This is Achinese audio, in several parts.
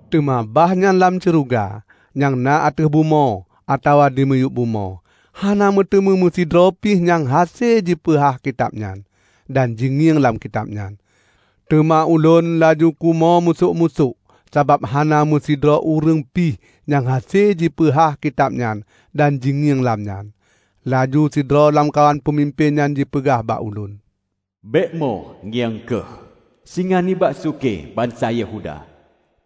Teuma bahnyan lam syeuruga, nyang na ateueh bumoe, atawa dimiyueb bumoe, hana meuteumé meusidroe pih nyang hase jipeuhah kitab nyan, dan jingieng lam kitab nyan. Teuma ulôn laju kumo musôk-musôk sabab hana meusidroe ureuëng pih nyang hase jipeuhah kitab nyan dan jingieng lam nyan. Laju sidroe lamkawan peumimpén nyan jipeugah bak ulôn, "Bék mo! Ngieng kheueh! Singa nibak sukée bansa Yehuda,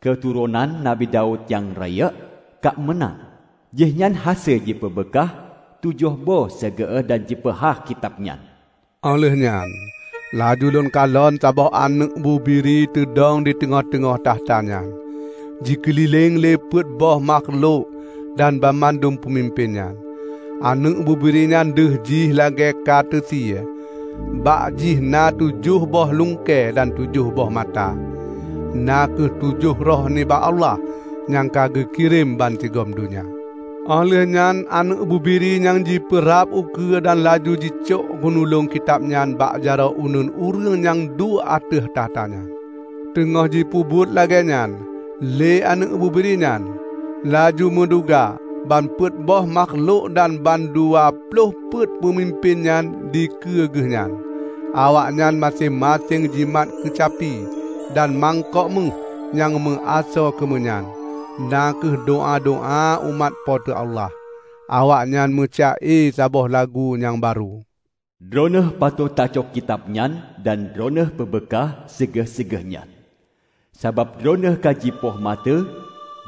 keuturonan nabi Daud nyang rayeuk, ka meunang. Jih nyan hase jipeubeukah tujoh boh segée dan jipeuhah kitab nyan." Óh lheueh nyan laju lôn kalon saboh Aneuëk Bubiri teudong diteungoh-teungoh takhta nyan, jikeulileng lé peuet boh makhlok dan mandum peumimpén nyan. Aneuëk Bubiri nyan deuh jih lagée ka teusie. Bak jih na tujoh boh lungkée dan tujoh boh mata: na kheueh tujoh roh nibak Allah nyang ka geukirém bansigom donya. Óh lheueh nyan Aneuëk Bubiri nyan jipeurab ukeue dan laju jicok gunulong kitab nyan bak jaroe uneuen ureuëng nyang duek ateueh takhta nyan. Teungoh jipeubuet lagée nyan lé Aneuëk Bubiri nyan, laju meuduga ban peuet boh makhlok dan ban dua ploh peuet peumimpén nyan dikeue geuh nyan. Awaknyan maséng-maséng jimat keucapi dan mangkok méuh nyang meuasoe keumeunyan, na kheueh doá-doá umat Po teu Allah. Awaknyan meuca-e saboh lagu nyang barô: "Droeneueh patot tacok kitab nyan dan Droeneueh peubeukah segée-segée nyan. Sabab Droeneueh ka jipoh maté,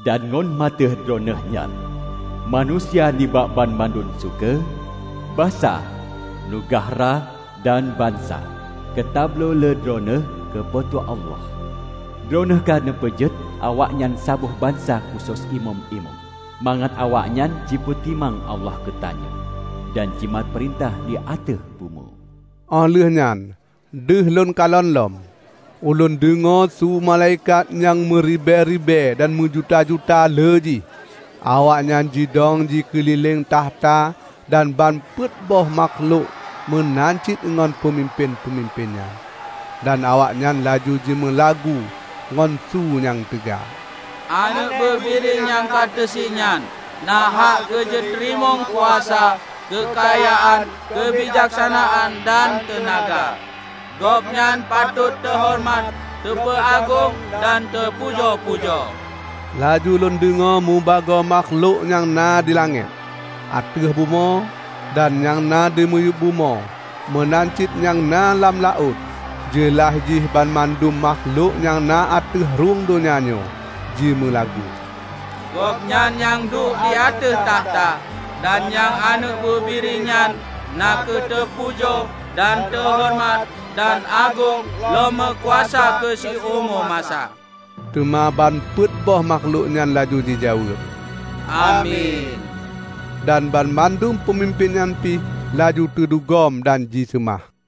dan ngon maté Droeneueh nyan, manusia nibak banmandum sukée, basa, neugahra dan bansa ka tabloe lé droeneueh keu Po teu Allah. Droeneueh ka neupeujeuet awaknyan saboh bansa khusos imeum-imeum, mangat awaknyan jipeutimang Allah geutanyoe, dan jimat peurintah di ateueh bumoe." Óh lheueh nyan deuh lôn kalon lom. Ulôn deungoe su malaikat nyang meuribée-ribée dan meujuta-juta lé jih. Awaknyan jidong jikeulileng takhta dan ban peuet boh makhlok meunan cit ngon peumimpén-peumimpén nyan. Dan awaknyan laju jimeulagu ngon su nyang teuga, "Aneuëk Bubiri nyang ka teusie nyan, na hak keujiteurimong kuasa, keukayaan, keubijaksanaan dan teunaga; Gobnyan patot teuhoreumat, teupeuagong dan teupujo-pujo!" Laju lôn deungoe mubagoe makhlok nyang na di langét, ateueh bumoe, dan nyang na dimiyueb bumoe meunan cit nyang na lam laôt -- jeulaih jih banmandum makhlok nyang na ateueh rhueng donya nyoe -- jimeulagu, "Gobnyan nyang duek di ateueh takhta, dan Nyang Aneuëk Bubiri nyan, na kheueh teupujo dan teuhoreumat dan agong lom meukuasa keu siumu masa!" Teuma ban peuet boh makhlok nyan laju jijaweueb, "Amin!" Dan banmandum peumimpén nyan pih laju teudugom dan jiseumah.